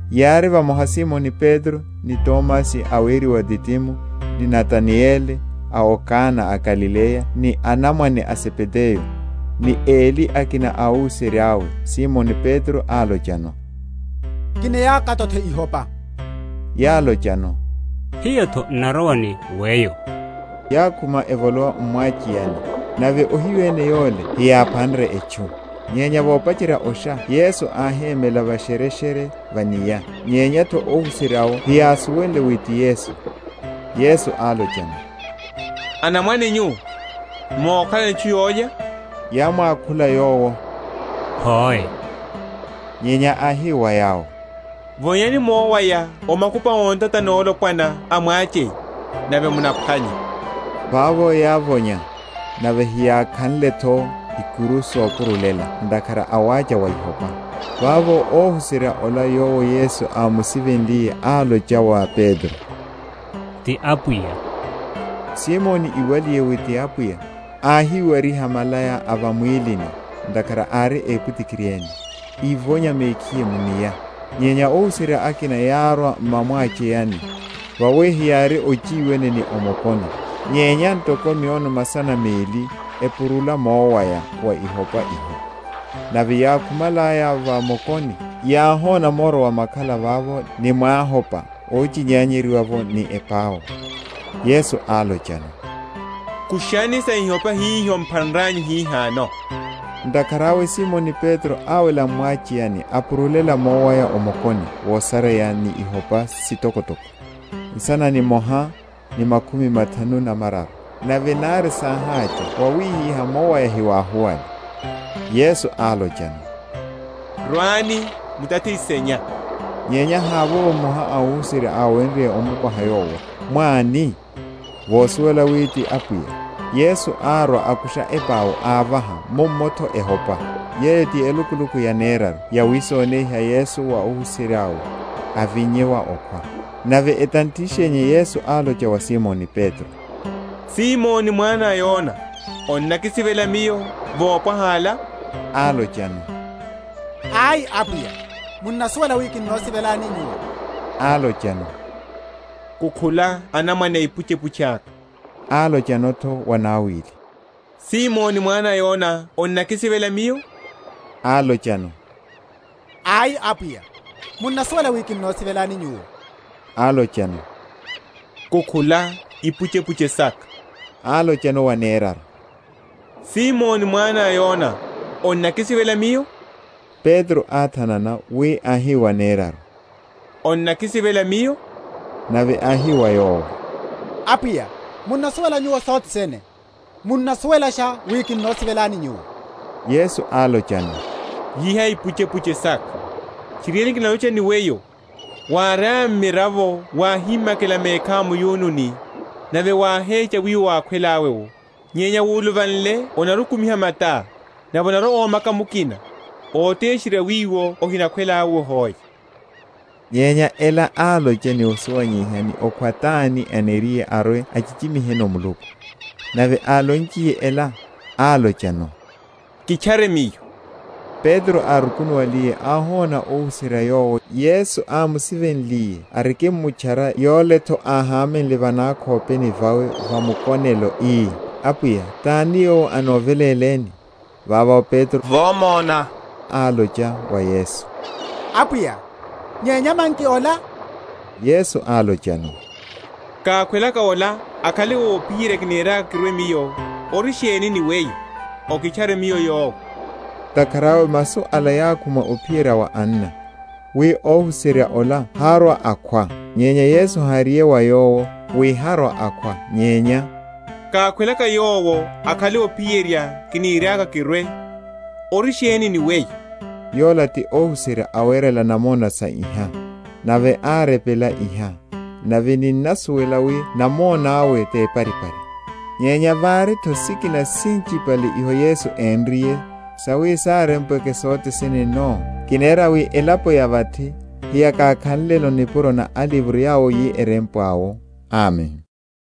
Yári vamoha Simoni Petro, ni Tomasi, aweriwa Didimo, ni Natanayeli a o Kana a Galileya, ni anamwane a Zebedayo, ni eli akina a óhuserya’we. Simoni Petro álochano, Kinaya katothe ihopa. Yálochano, Hiyo’tho n’narowa ni weyo. Yákhuma, evolowa m’mwacheyani; nave ohiyu ene yowo heyáphanre etchu. Nyenya vopacherya osha Yesu áhémela vashereshere va’nia, nyenya’tho óhuserya’wo heyásuwenle wi ti Yesu. Yesu álochano, Anamwane nyu, mokhalano etchu yólya? Yámwakhula Yowo, Hoe. Nyenya áhi wa yawo, Vonyani mowaya o makupa a ntata nolopwana a mwacheya, nave munaphwanya. Vavo yávonya, nave heyákhanle’tho ikuru sopurulela ntakhara a wacha wa ihopa. Vavo óhuserya ola yowo Yesu ámusivenliye álocha wa Petro, Ti Apwiya. Simoni iwaliye wi ti Apwiya, áhiwariha malaya a va mwílini ntakhara ári epwitikiri ene, ívonya mekhiye mu’nia. Nyenya óhuserya akina yárwa m’mwa‐mwacheyani, vawi heyári ochiwene ni o mokoni, nyenya ntoko miono masana meli, epurula mowaya wa ihopa iho. Nave yákhumalaya va mokoni, yáhona moro wa makhala vavo, ni mwéhopa óchinyanyeryiwa’vo, ni epau. Yesu álochano, Kushani sa ihopa hiho m’phanranyu hihano. Ntakhara awe Simoni Petro áwela m’mwacheyani apurulela mowaya o mokoni wosareya ni ihopa sitokotoko, nsana nimoha, ni makhumi mathanu na mararu; nave nari sáhacha wawihiha, mowaya hiwáhuwale. Yesu álochano, Rwani mutathishenya. Nyenya havovo mmoha a óhuserya áwenrye omukoha Yowo, Mwá ani? vosuwela wi ti Apwiya. Yesu árwa akusha epau ávaha, mummo’tho ehopa. Yeyo ti elukuluku yaneraru yawisoneiha Yesu wa óhuserya we, avinnye wa okhwa. Nave etanthishenya Yesu álocha wa Simoni Petro, Simoni mwana a Yona, onnakisivela Miyo wopwaha ala? Álochano, Ai, Apwiya; munnasuwela wi kinnosivelani Nyuwo. Álochano, Kukhula anamwane aipuchepuche aka. Álochano’tho wanawili, Simoni mwana a Yona onnakisivela Miyo? Álochano, Ai, Apwiya; munnasuwela wi kinnosivelani Nyuwo. Álochano, Kukhula ipuchepuche saka. Álochano waneraru, Simoni mwana a Yona, onnakisivela Miyo? Petro áthanana wi áhi waneraru, Onnakisivela Miyo? nave áhi wa Yowo, Apwiya, munnasuwela Nyuwo sothe sene; munnasuwelasha wi kinnosivelani Nyuwo. Yesu álochano, Lyiha ipuchepuche saka. Tchiriene, kinalocha ni weyo, wáriá mmiravo wáhimakela mekhá mu’yununi, nave wáhecha wiwo wákhwelá’wo; nyenya wuluvanle onarwa‐okumiha matá, nave anarwa‐omaka mukina, ótesherya wiwo ohinakhwelá’wo hoe. Nyenya ela álocha ni osuwanyeiha ni okhwa tani aniriye arwe achichimiheno Muluku. Nave álonchiye ela, álochano, Kitchare Miyo. Petro, árukunuwaliye áhona óhuserya yowo Yesu ámusivenliye arikimtchara, yole’tho áhámenle va nakhopeni vawe va mukonelo, ii, Apwiya, tani yowo anoveléleni? Vavo Petro vomona, álocha wa Yesu, Apwiya, nyenya manki ola? Yesu álochano, Kákhwelaka ola akhale ophiyerya kiniriaka kirwe Miyo, ori sheni ni weyo? okitchare Miyo yowe. Ntakhara awe masu ala yákhuma ophiyerya wa anna, wi óhuserya ola harwa‐akhwa. Nyenya Yesu háriye wa yowo, wi harwa‐akhwa; nyenya, kákhwelaka yowo akhale ophiyerya kiniriaka kirwe, ori sheni ni weyo? Yola ti óhuserya awerela namona sa iha, nave árepela iha; nave ninnasuwela wi namona’we teparipari. Nyenya vari’tho sikina sinchipale hiho Yesu énriye, sawi sárempweke sothe sene no, kinera wi elapo ya vathi heyákakhanleno nipuro na alivro yawo yirempwe awo. Amen.